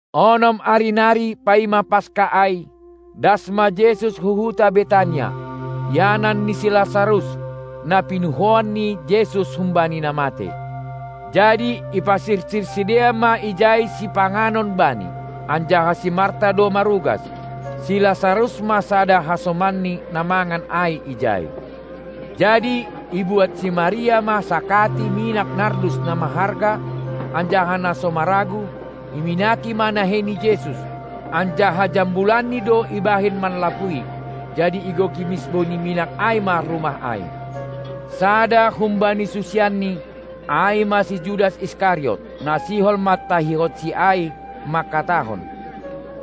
Onom ari nari paima Paska ai, das ma Jesus hu huta Betania, ianan ni si Lasarus, na pinuhoan ni Jesus humbani na matei. Jadi ipasirsir sidea ma ijai sipanganon Bani, anjaha si Marta do marugas; si Lasarus ma sada hasomanni, na mangan ai ijai. Jadi ibuat si Maria ma sakati minak nardus na maharga anjaha na so maragu; iminaki ma nahei ni Jesus, anjaha jambulanni do ibahen manlapui. Jadi igoki misbou ni minak ai ma rumah ai. Sada humbani susianNi, ai ma si Judas Iskariot, na sihol mantahihonSi ai, mangkatahon: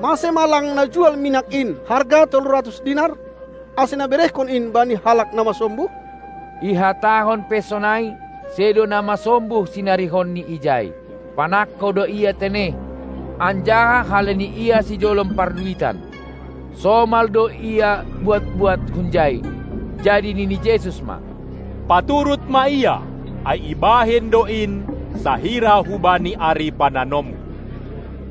Mase ma lang najual minak in harga tolu ratus dinar, ase naberehkon in bani halak na masombuh? Ihatahon pe sonai, sedo na masombuh sinarihonni ijai; panangko do ia tene, anjaha halani ia sijolom parduitan, somal do ia buat-buat hunjai. Jadi nini Jesus ma: Paturut ma ia, ai ibahen do in sahira hubani ari pananomHu.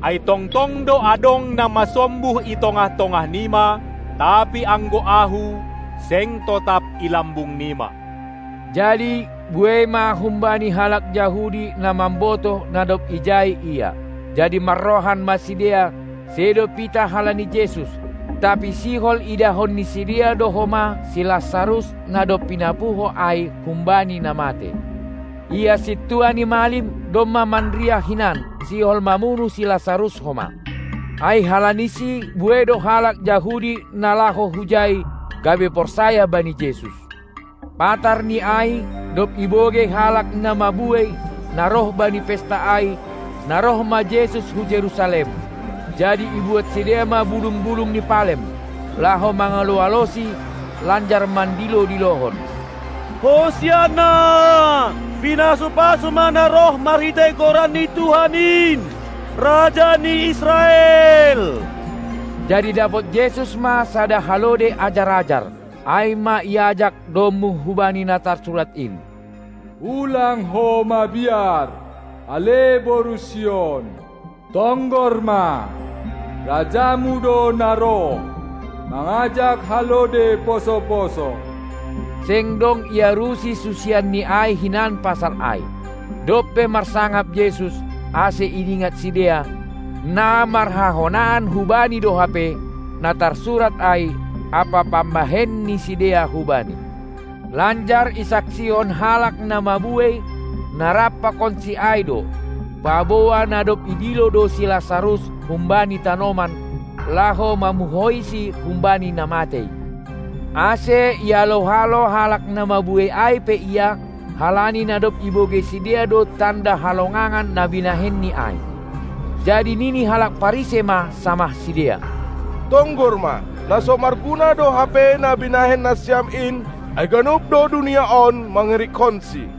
Ai tongtong do adong na masombuh i tongah-tongah nima, tapi anggo Ahu, seng totap i lambung nima. Jadi buei ma humbani halak Jahudi na mambotoh, na dob ijai Ia; jadi marrohan ma sidea, sedo pitah halani Jesus, tapi sihol idahon ni sidea do homa si Lasarus na dob pinapuho ai humbani na matei. Ia sintua ni malim domma manriah hinan sihol mamunuh si Lasarus homa, ai halanisi buei do halak Jahudi na laho hujai, gabe porsaya bani Jesus. Patarni ai, dob ibogei halak na mabuei, na roh bani pesta ai, na roh ma Jesus hu Jerusalem, jadi ibuat sidea ma bulung-bulung ni palem, laho mangalo-aloSi lanjar mandilo-dilohon: Hosianna! Pinasu-pasu ma na roh marhitei goran ni Tuhan in, Raja ni Israel! Jadi dapot Jesus ma sada halode ajar-ajar, ai ma iajak domu hubani na tarsurat in: Ulang ho mabiar, ale boru Sion. Tonggor ma, Rajamu do na roh, mangajak halode poso-poso. Seng dong iarusi susianNi ai hinan pasal ai; dob pe marsangap Jesus, ase idingat sidea, na marhahonaan hu Bani do hape na tarsurat ai ampa pambahen ni sidea hu Bani. Lanjar isaksihon halak na mabuei, na rap pakonSi ai do, paboa na dob idilo do si Lasarus humbani tanoman, laho mamuhoiSi humbani na matei. Ase ialo-alo halak na mabuei ai pe Ia, halani na dob ibogei sidea do tanda halongangan na binahenNi ai. Jadi nini halak Parisei ma samah sidea: Tonggor ma, na so marguna do hape na binahen nasiam in, ai ganup do dunia on mangirikkonSi.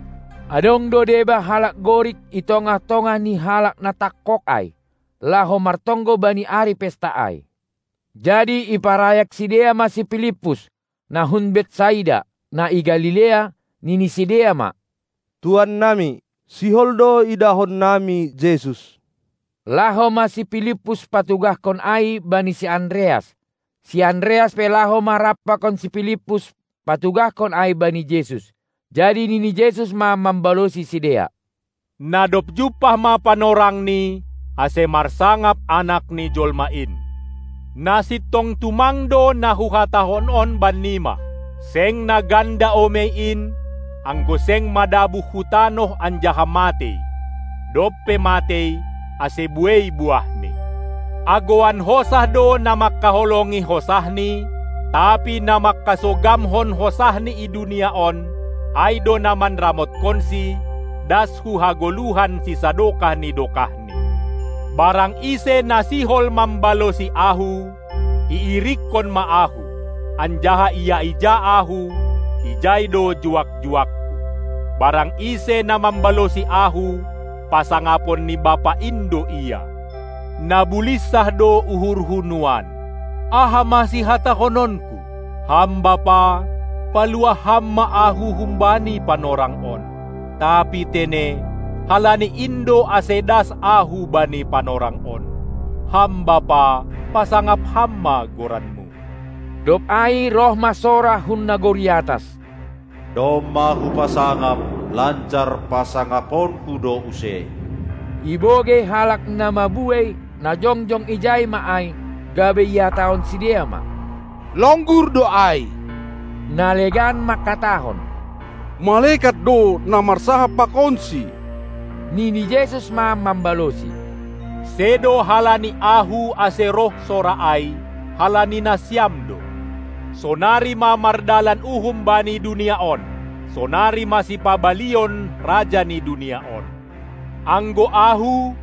Adong do deba halak Gorik i tongah-tongah ni halak na tangkog ai, laho martonggo bani ari Pesta ai. Jadi iparayak sidea ma si Pilippus, na hun Betsaida, na i Galilea, nini sidea ma: Tuan nami, sihol do idahon nami Jesus. Laho ma si Pilippus patugahkon ai bani si Andreas; si Andreas pe laho ma rap pakon si Pilippus patugahkon ai bani Jesus. Jadi nini Jesus ma mambalosi sidea: Na dob jumpah ma panorangni, ase marsangap Anak ni jolma in! Na sintong tumang do na Huhatahon on bannima: Seng na ganda omei in, anggo seng madabuh hu tanoh anjaha matei, dob pe matei, ase buei buahni. Agouan hosah do na mangkaholongi hosahni, tapi na mangkasogamhon hosahni i dunia on, ai do na manramotkonsi das hu hagoluhan sisadokah ni dokahni. Barang ise na sihol mambalosi Ahu, iirikkon ma Ahu; anjaha ia ija Ahu, ijai do juak-juakKu. Barang ise na mambalosi Ahu, pasangapon ni Bapa in do ia. Na bulinsah do uhurHu nuan. Aha ma sihatahononKu? Ham Bapa, paluah Ham ma Ahu humbani panorang on. Tapi tene, halani in do ase das Ahu bani panorang on. Ham Bapa, pasangap Ham ma goranMu! Dob ai roh ma sora hun nagori atas: Domma Hupasangap, lanjar pasangaponKu do use! Ibogei halak na mabuei, na jongjong ijai ma ai, gabe ihatahon sidea ma: Longgur do ai! Na legan mangkatahon: Malekat do, na marsahap pakonSi! Nini Jesus ma mambalosi: Sedo halani Ahu, ase roh sora ai, halani nasiam do. Sonari ma mardalan uhum bani dunia on, sonari ma sipabalion raja ni dunia on. Anggo Ahu,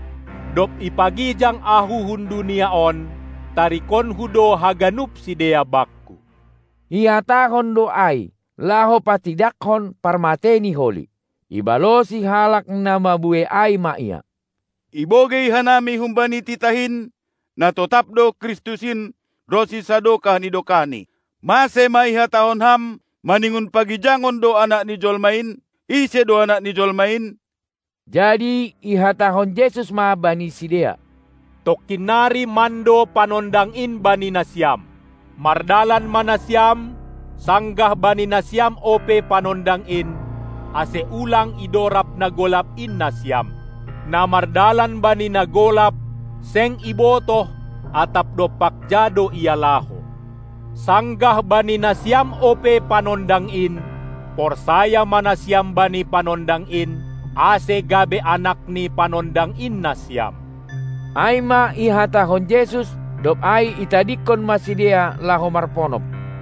dob ipagijang Ahu hun dunia on, tarikonKu do haganup sidea Bakku. Ihatahon do ai, laho patidakkon parmateiNi holi. Ibalosi halak na mabuei ai ma Ia: Ibogei hanami humbani titah in, na totap do Kristus in ronsi sadokah ni dokahni. Mase ma ihatahon Ham: Maningon pagijangon do Anak ni jolma in? Ise do Anak ni jolma in? Jadi ihatahon Jesus ma bani sidea: Tongkin nari mando Panondang in bani nasiam. Mardalan ma nasiam, sanggah bani nasiam ope Panondang in, ase ulang idorab na golap in nasiam; na mardalan bani na golap, seng ibotoh, atap dompak ja do ia laho. Sanggah bani nasiam ope Panondang in, porsaya ma nasiam bani Panondang in, ase gabe anak ni Panondang in nasiam! Ai ma ihatahon Jesus, dob ai itadingkon ma sidea laho marponop.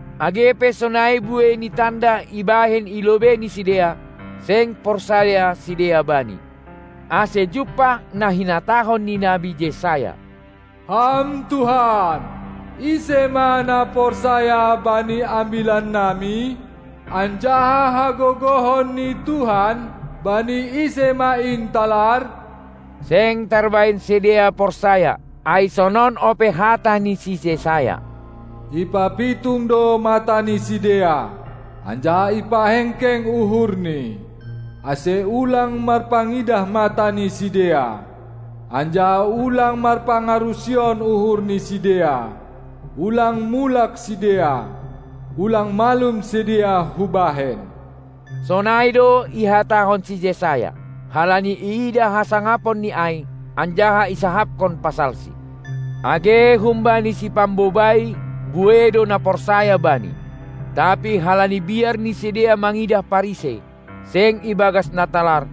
Age pe sonai buei ni tanda ibahen i lobei ni sidea, seng porsaya sidea Bani, ase jumpah na hinatahon ni nabi Jesayas: Ham Tuhan, ise ma na porsaya bani ambilan nami? Anjaha hagogohon ni Tuhan, bani ise ma in talar? Seng tarbahen sidea porsaya, ai sonon ope hata ni si Jesaya: Ipapitung do mata ni sidea, anjaha ipahengkeng uhurni, ase ulang marpangidah mata ni sidea, anjaha ulang marpangarusion uhur ni sidea; ulang mulak sidea, ulang malum sidea Hubahen. Sonai do ihatahon si Jesaya, halani iidah hasangaponNi ai, anjaha isahapkon pasalSi. Age humbani sipambobai buei do na porsaya Bani, tapi halani biar ni sidea mangidah Parisei, seng ibagas na talar,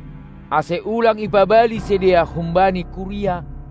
ase ulang ipabali sidea humbani kuria,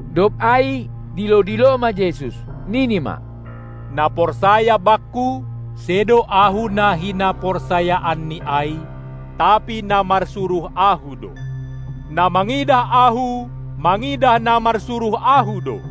Dob ai dilo-dilo ma Jesus, nini ma: Na porsaya Bakku, sedo Ahu na hinaporsayaanni ai, tapi na marsuruh Ahu do. Na mangidah Ahu, mangidah na marsuruh Ahu do.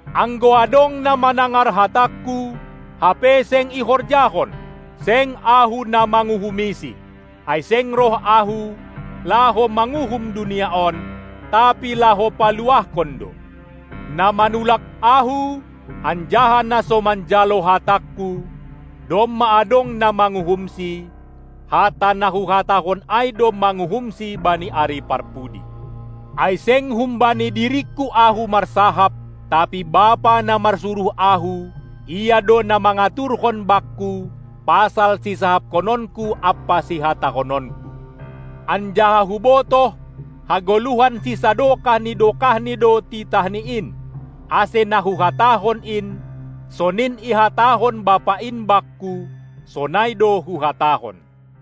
Anggo adong na manangar hatangKu, hape seng ihorjahon, seng Ahu na manguhumisi; ai seng roh Ahu, laho manguhum dunia on, tapi laho paluahkon do. Na manulak Ahu, anjaha na so manjalo hatangKu, domma adong na manguhumsi; hata na Huhatahon ai do manguhumsi bani ari parpudi. Ai seng humbani diringKu Ahu marsahap, tapi Bapa, na marsuruh Ahu, Ia do na mangaturhon Bakku pasal sisahapkononKu ampa sihatahononKu. Anjaha Hubotoh, hagoluhan sisadokah ni dokahni do titahNi in. Ase na Huhatahon in, sonin ihatahon Bapa in Bakku, sonai do Huhatahon.